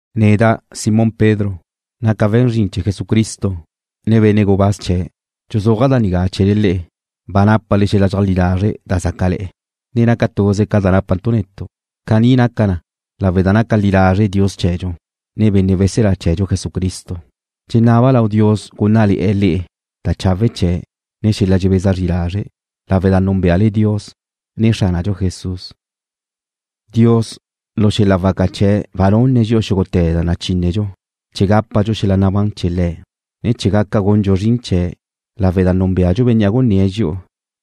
Neda', Simón Pedro, naca' we̱n zrin chee̱ Jesucristo, ne benne' gubáz chee̱'. Dxuzúaja' da nigá chee̱le le'e, ba nápale xel-la' dxeajlí lazre' da zácale̱'e̱, ne naca tuze ca da nápantu' netu'. Caní naca lawe' da naca li lazre' Dios chee̱dxu, ne Benne' Weselá chee̱dxu Jesucristo. Dxenaba' lau Dios gúnnale̱'e̱ le'e da chawe' chee̱', ne xel-la' dxebeza zri lazre', lawe' da núnbeale Dios, ne Xránadxu Jesús. Dios lu xel-la' waca chee̱' ba nunne̱' dxi'u xúgute̱ da nachínedxu chee̱ gápadxu xel-la' nabán chee̱ Le̱', ne chee̱ gaca gundxu zrin chee̱', lawe' da núnbeadxu Bénnea' gunné̱' dxi'u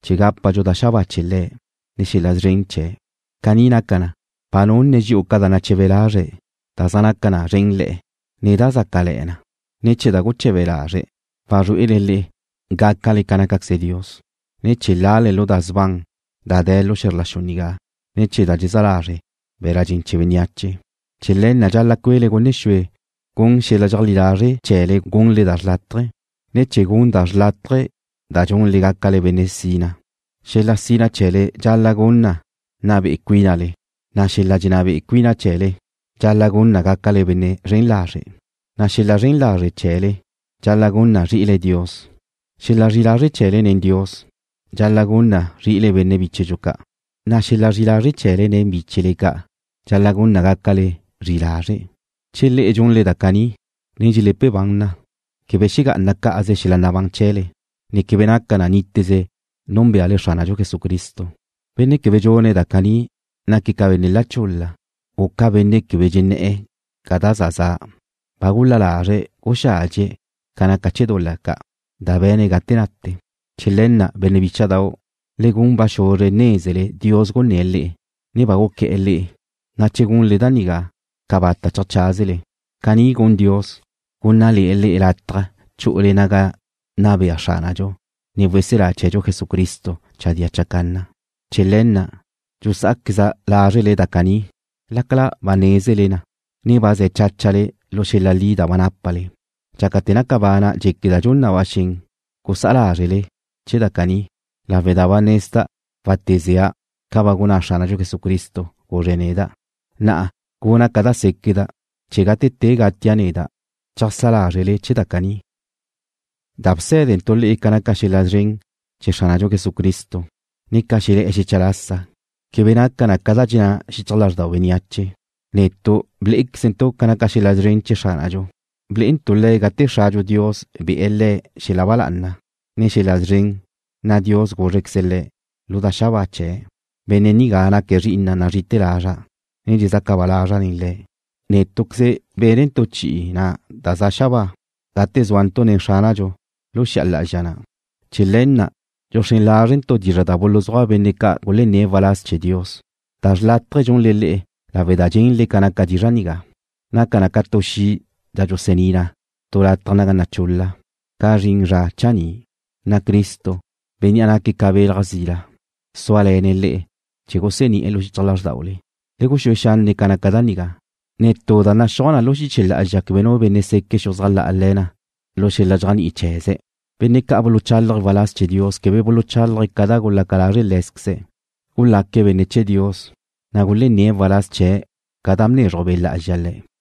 chee̱ gápadxu da xabáa chee̱ Le̱', ne xel-la' szren chee̱'. Caní naca na, ba nunne̱' dxi'u ca da nache̱be lazre̱', da zaj naca na szrénle̱'e̱, ne da zaj zácale̱'e̱ na, chee̱ ne̱ chee̱ da guche̱be lazre̱' wazrué'ele le'e gácale ca nácaqueze Dios, ne chee̱ lale lu da sban da dxaca lu xe̱zr la xu nigá ne̱ chee̱ da dxezá lazre' be̱la' dxen chee̱ bénneache. Chee̱ le̱ na' dxal-la' cue'le gunne xue gun xel-la' dxeajlí lazre' chee̱le gunle da xrlátaje, ne chee̱ gun da xrlátaje da dxunle gácale benne' sina. Xel-la' sina chee̱le dxal-la' gun na nna be'e cuínale, na' xel-la' dxenná be'e cuina chee̱le dxal-la' gun na gácale benne' zren lazre', na' xel-la' zren lazre' chee̱le dxal-la' gun na zri'ile Dios. Xel-la' zri'i lazre' chee̱le nen Dios dxal-la' gun na zri'ile benne' bíchedxu ca', na' xel-la' zri'i lazre' chee̱le nen bíchele ca' dxal-la' gun na gácale zri'i lazre'. Che le'e dxunle da caní, ne dxele̱pe ban na, quebe xegá'ana cá'aze xel-la' nabán chee̱le, ne quebe naca na níteze núnbeale Xránadxu Jesucristo. Benne' quebe dxune̱' da caní naque̱' ca benne' la chul-la, u ca benne' quebe dxenné̱'e̱ ca da za za'. Ba gul-la lazre̱' guxádxie̱' ca naca chee̱ dul-la ca' da be̱ne̱' gate nate. Chee̱ le̱ na', benne' bícha'dau', le gun ba xuzre nézele Dios gunné̱' le'e, ne ba guqué̱'e̱ le'e, na' che gunle da nigá, cabata' cheajcházele. Caní gun Dios, gúnnale̱'e̱ le'e lataj chu'ule naga nna bea Xránadxu, ne weselá chee̱dxu Jesucristo chadía chacanna. Chee̱ le̱ na' tu dxusá'azqueza' lázrele da caní, lácala ba nézele na, ne ba ze̱ cháchale lu xel-la' li da ba nápale. Dxácate̱ naca bana' dxéqueda' dxun na ba xen gusá'a lázrele chee̱ da caní lawe' da ba nezda' wátezea' ca ba gunná Xránadxu Jesucristo, guzre̱' neda'. Na'a guna' ca da séqueda' chee̱ gate te gatia' neda', cheajsá lázrquezle chee̱ da caní. Da bsé̱dentu' le'e ca naca chee̱ xel-la' szren chee̱ Xránadxu Jesucristo, ne ca xelé̱'e̱ xecha lasa quebe naca na ca da dxenná xichaj lázrdau bénneache. Netu' blé'equezentu' ca naca xel-la' szren chee̱ Xránadxu. Blé'entu' Le̱' gate Xradxu Dios be̱'e̱ Le̱' xel-la' ba lá'ana, ne xel-la' szren, na' Dios gúzrequeze̱' Le̱' lu da xabáa chee̱': “Benne' nigá naque̱' Zri'ina' nazri'ite̱ lazra', ne dxezaca ba lazra' nen Le̱'.” Nétu'queze bénentu' chi'i na' da za na xabáa gate zúantu' nen Xránadxu lu xi'a lá'azxa na'. Chee̱ le̱ na' dxuxrén lázredxantu' dizra' da buluzúaj benne' ca' gulenné̱' waláz chee̱ Dios. Da xrlátaje dxunle le'e lawe' da dxenle ca naca dizra' nigá. Naca na ca tu xi' da dxusení na tu lataj naga naca chul-la ca zrin zra chaní', na' Cristo, Bénnea' naque̱' ca belaj zila súale̱ne̱' le'e chee̱ gusení'e̱ lu xichaj lázrdaule. Le guxúe xanne' ca naca da nigá. Netú da naxúaj na lu xiche lá'azxa quebe nu benne' seque' xuzájle̱'e̱ na lu xel-la' dxéajni'i chee̱ze̱'. Benne' ca' buluchálaje̱' waláz chee̱ Dios quebe buluchálaje̱' ca da gulaca lázrequeze le̱'. Gulaque̱' benne' chee̱ Dios, na' gulenné̱' waláz chee̱' ca da bnezruj Be' Lá'azxa le̱'.